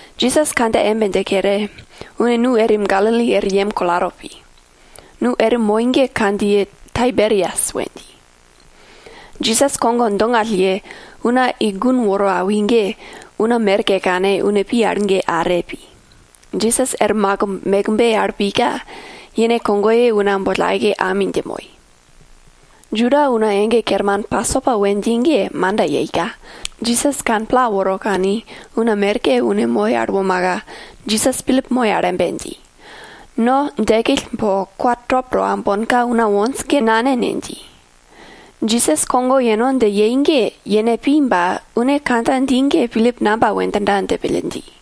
Jisas kandja embe dje kere, une nu erim Galili er yem kolato pi. Nu erim moi ge kandjiye Taiberias we dji. Jisas kogo dongall ye, una i gun woro awi ge, una merke kane une pi al ge are pi. Jisas er makimb mekbe al pika, yene kogoye una boll aike ami dje moi. Juda una ege kerman Pasopa we dji ge manda yeika, Jisas kane pla woro kani, una merke une moi al womaka, Jisas Pilip moi al embe dji, no djekill po kwa top to aumbonka una wonj ge nane ne? dji. Jisas kogo yeno dje yei ge yene pi ba, une kandja dji ge Pilip namba we djinda dje pille dji.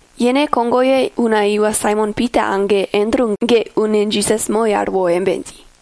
Yene kogoye una iwa Saimon Pita age Andru ge une Jisas moi al wo embe dji,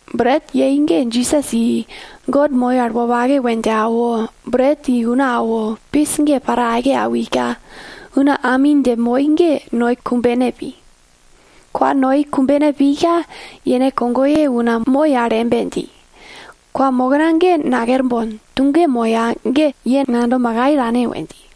Bret yei ge Jisas i, God moi al wopake we dje awo, bret i una awo, pis ge para aike awika, una ami dje moi ge noi kumbene pi. Kwa noi kumbene pika, yene kogoye una moi al embe dji, kwamokna ge nakerbon, tuge moya ge ye ngando makai tane we dji.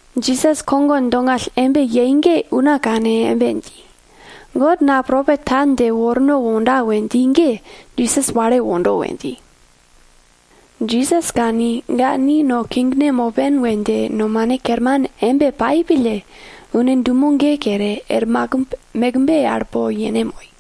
Jisas kogo dongall embe yei ge una kane embe dji, God na propet ta dje worno wonda we dji ge Jisas wale wondo we dji. Jisas kani, ga ni no kingne mopen we dje nomane kerman embe pai pille, une dumo ge kere, er makimb mekbe al po yene moi.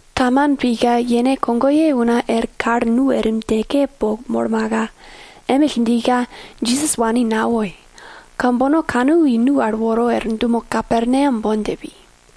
Taman pika yene kogoye una er kal nu erim djeke po molmaka, emill djika, Jisas wani nawoi. Kambono kanu i nu al woro er dumo Kaperneam bon dje pi.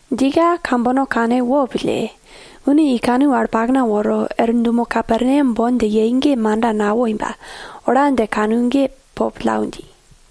Djika kambono kane wo pille, une i kanu al pakna woro, er dumo Kaperneam bon dje yei ge manda nawoi ba, ola dje kanu ge po pillau dji.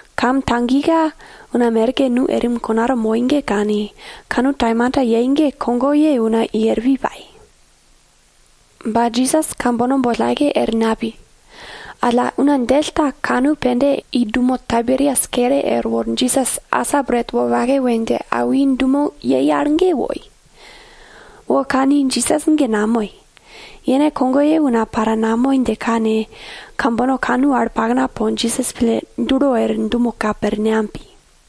Kam tagika una merke nu erim konato moi ge kani, kanu taimanta yei ge kogoye una i er pi pai. Ba Jisas kambono boll aike er napi. Alla una djell ta kanu pende i dumo Taiberias kere erwo Jisas asa bret wopake we dje awi dumo yei al ge woi. Wo kani Jisas ge namoi, yene kogoye una para namoi dje kane, kambono kanu al pakna po Jisas pille dulo er dumo Kaperneam pi.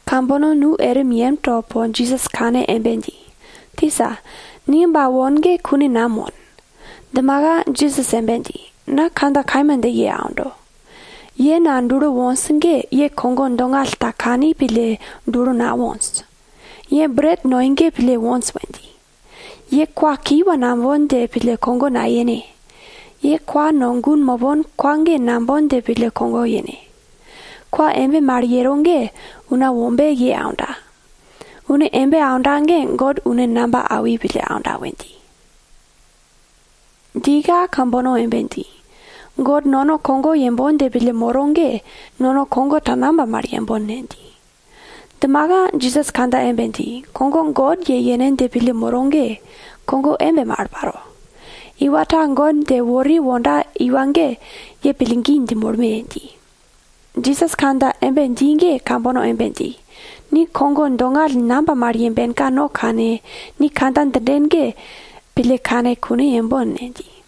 Kambono nu erim yemto po Jisas kane embe dji, tisa, ni ba won ge kune nam won? Djimaka Jisas embe dji, na kandja kaima dje ye aundo, ye na pille dulo wonj ge ye kogo dongall ta kani pille, dulo nawonj. Ye bret noi ge pille wonj we dji. Ye kwa kiwa nambon dje pille kogo nayene! Ye kwa no gun mopon kwa ge nambon dje pille kogo yene! Kwa embe mal yero ge Una Wombe ye aunda. Une embe aunda ge God une namba awi pille aunda we dji. Djika kambono embe dji, God nono kogo yembon dje pille moro ge, nono kogo ta namba mal yembon ne? dji. Djimaka Jisas kandja embe dji, kogo God ye yene dje pille moro ge, kogo embe mal paro. Iwa ta God dje wori wonda iwa ge ye pillgi dje molme! dji. Jisas kandja embe dji ge kambono embe dji, ni kogo dongall namba mal yembenka no kane, ni kandja djinden ge pille kane kune yembon ne? dji.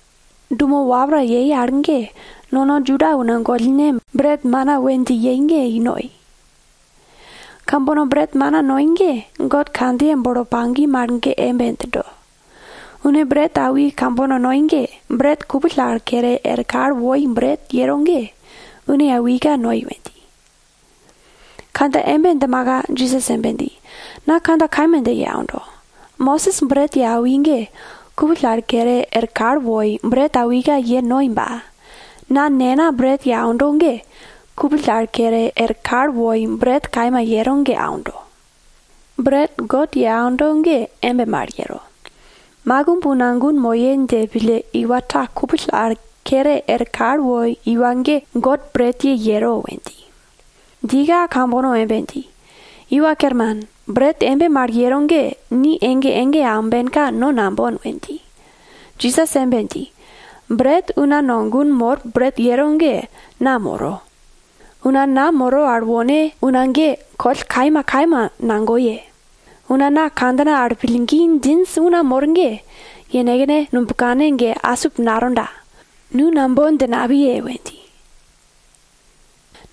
Dumo wapra yei al ge, nono Juda una gollne, bret mana we dji yei ge i noi. Kambono bret mana noi ge, God kandjiye bolo pagi mal ge embe djindo, une bret awi kambono noi ge, bret kupill al kere er kal woi bret yero ge, une awika noi we dji. Kandja embe djimaka Jisas embe dji, na kandja kaima dje ye aundo, Mosis bret ye awi ge, kupill al kere er kal woi bret awika ye noi ba, na Nena bret ye aundo ge, kupill al kere er kal woi bret kaima yero ge aundo. Bret God ye aundo ge embe mal yero. Makimb una gun moye dje pille iwa ta kupill al kere er kal woi iwa ge God bretye yero we dji. Djika kambono embe dji, iwa kerman, bret embe mal yero ge ni ege ege aumbenka no nambon we dji. Jisas embe dji, bret una no gun mor bret yero ge na moro. Una na moro al wone una ge, koll kaima kaima nagoye. Una na kandjina al pillgi djinj una mor ge, yenekne nubkane ge asip natonda, nu nambon dje napiye we dji.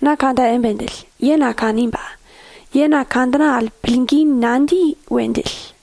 Na kandja embe djill, ye na kani ba, ye na kandjina al pillgi nadji we djill.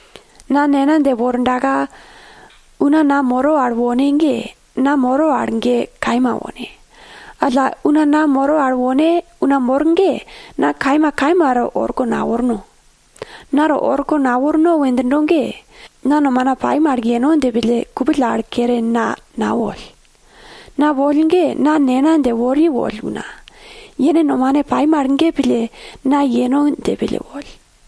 Na Nena dje wordaka una na moro al wone ge, na moro al ge kaima wone. Alla una na moro al wone una mor ge, na kaima kaima to orko naworno. Na to orko naworno we djindo ge, na nomana pai mal yeno dje pille kupill al kere na nawoll. Na woll ge, na Nena dje wori woll una, yene nomane pai mal ge pille na yeno dje pille woll.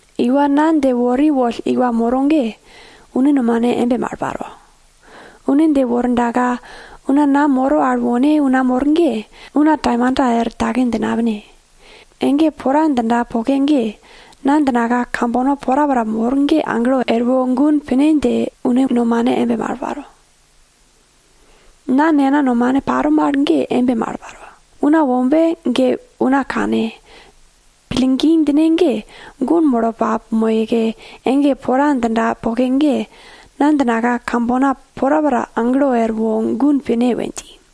Iwa na dje wori woll iwa moro ge, une nomane embe mal paro. Une dje wordaka una na moro al wone una mor ge, una taimanta er take dje napine. Ege pora djinda poke ge, na djinaka kambono porapora mor ge aglo erwo gun pine dje une nomane embe mal paro. Na Nena nomane paro mal ge embe mal paro. Una Wombe ge una kane, pillgi djine ge, gun molo pamoyeke, ege pora djinda poke ge, na djinaka kambono porapora aglo erwo gun pine we dji.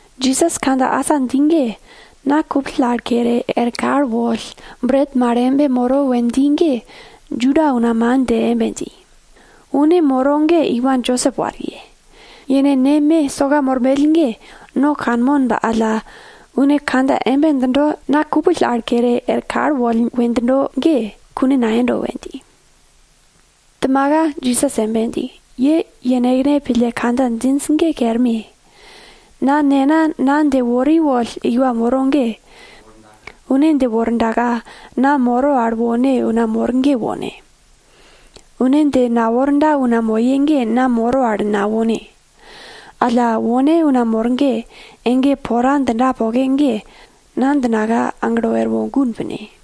Jisas kandja asa dji ge, na kupill al kere er kal woll bret mal embe moro we dji ge, Juda una man dje embe dji, une moro ge iwa Josep wariye. Yene neme soka mormell ge no kanmon ba alla, une kandja embe djindo, na kupill al kere er kal woll we djindo ge, kune nayendo we dji. Djimaka Jisas embe dji, ye yenekne pille kandja djinj ge kerme! Na Nena na dje wori woll iwa moro ge, une dje wordaka na moro al wone una mor ge wone. Une dje naworda una moye ge na moro al nawone. Alla wone una mor ge, ege pora djinda poke ge, na djinaka aglo erwo gun pine.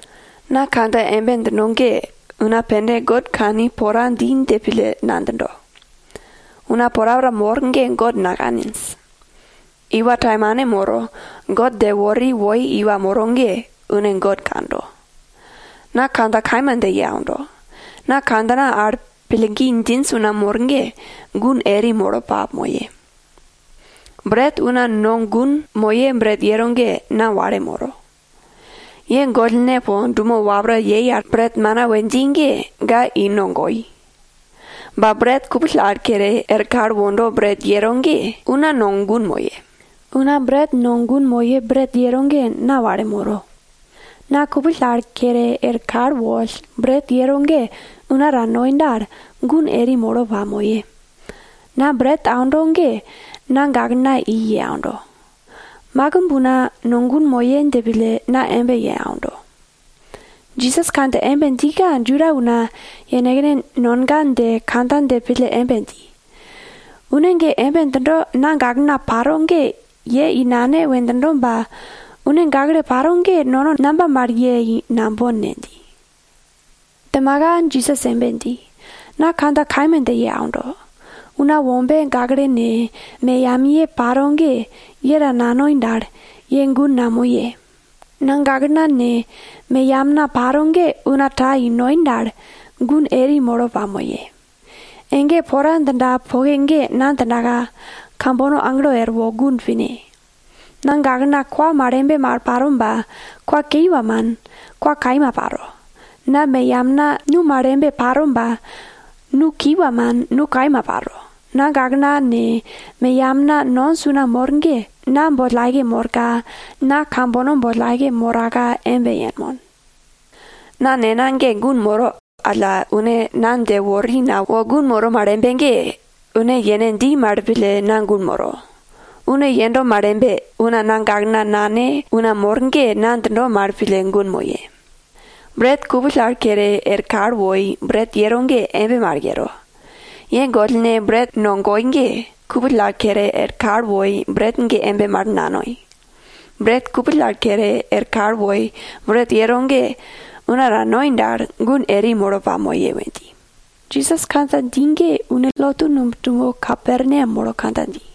Na kandja embe djindo ge, una pende God kani pora dji dje pille nadjindo. Una porapora mor ge God nakaninj. Iwa taimane moro, God dje wori woi iwa moro ge, une God kando. Na kandja kaima dje ye aundo, na kandjina al una pillgi djinj una mor ge, gun eri molo pamoye. Bret una no gun moye bret yero ge na wale moro. Ye gollne po dumo wapra yei al bret mana we dji ge ga i no goi. Ba bret kupill al kere er kal wondo bret yero ge, una no gun moye. Una bret no gun moye bret yero ge na wale moro. Na kupill al kere er kal woll, bret yero ge una ta noi dal, gun eri molo pamoye. Na bret aundo ge na gaklena i ye aundo. Makimb una no gun moye dje pille na embe ye aundo. Jisas kandja embe djika Juda una, yenekne nonga dje kandja dje pille embe dji, une ge embe djindo, na gaklena paro ge ye i nane we djindo ba, une gakle paro ge nono namba mal ye i nambon ne? dji. Djimaka Jisas embe dji, na kandja kaima dje ye aundo, Una Wombe gakle ne, meyamiye paro ge, ye ta nanoi dal, ye gun namoye. Na gaklena ne, meyamna paro ge una ta i noi dal, gun eri molo pamoye. Ege pora djinda poke ge na djinaka, kambono aglo erwo gun pine. Na gaklena kwa mal embe paro ba, kwa kiwa man, kwa kaima paro. Na meyamna nu mal embe paro ba, nu kiwa man, nu kaima paro. Na gaklena ne, meyamna nonj una mor ge, na boll aike morka, na kambono boll aike moraka embe yenmon. Na nena ge gun moro alla une na dje wori na wo gun moro mal embe ge, une yene dji mal pille na gun moro. Une yendo mal embe, una na gaklena nane una mor ge na djindo mal pille gun moye. Bret kupill al kere er kal woi bret yero ge embe mal yero. Ye gollne bret no goi ge, kupill al kere er kal woi bret ge embe mal nanoi. Bret kupill al kere er kal woi bret yero ge, una ta noi dal, gun eri molo pamoye we dji. Jisas kandja dji ge une lotu numb dumo Kaperneam molo kandja dji.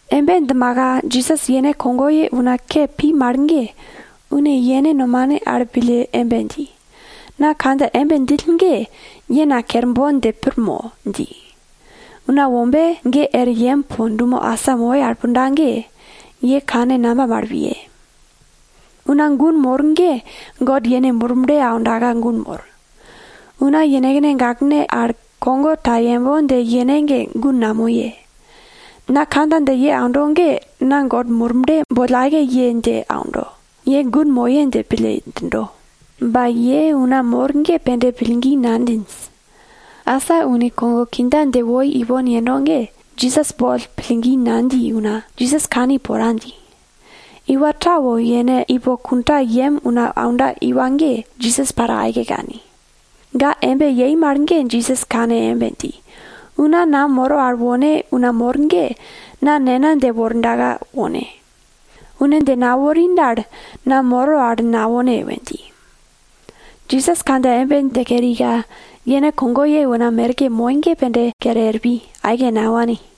Embe djimaka Jisas yene kogoye una ke pi mal ge, une yene nomane al pille embe dji, na kandja embe djill ge, ye na kerbon dje pir mo? dji. Una Wombe ge er yem po dumo asa moi al punda ge, ye kane namba mal piye? Una gun mor ge God yene Murble aundaka gun mor. Una yenekne gaklene al kogo ta yembon dje yene ge gun namoye. Na kandja dje ye aundo ge na God Murble boll aike ye dje aundo, ye gun moye dje pille djindo. Ba ye una mor ge pende pillgi nadjinj. Asa une kogo kindja ye woi ipon yendo ge, Jisas boll pillgi nadji una, Jisas kani pora dji. Iwa ta wo yene ipo kundayem una aunda iwa ge, Jisas para aike kani. Ga embe yei mal ge Jisas kane embe dji, una na moro al wone una mor ge, na Nena dje wordaka wone. Une dje nawori dal, na moro al nawone we dji. Jisas kandja embe dje kerika, yene kogoye una merke moi ge pende, kere er pi, aike nawani.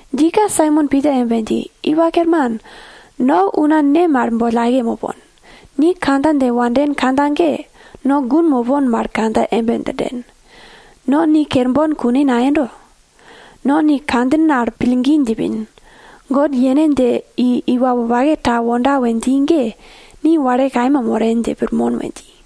Djika Saimon Pita embe dji, iwa kerman, no una ne mal boll aike mopon? Ni kandja dje wanden kandja ge, no gun mopon mal kandja embe djinden, no ni kerbon kune nayendo. No ni kandjin al pillgi djipin, God yene dje i iwa wopake ta wonda we dji ge, ni wale kaima moren dje pirmon we dji.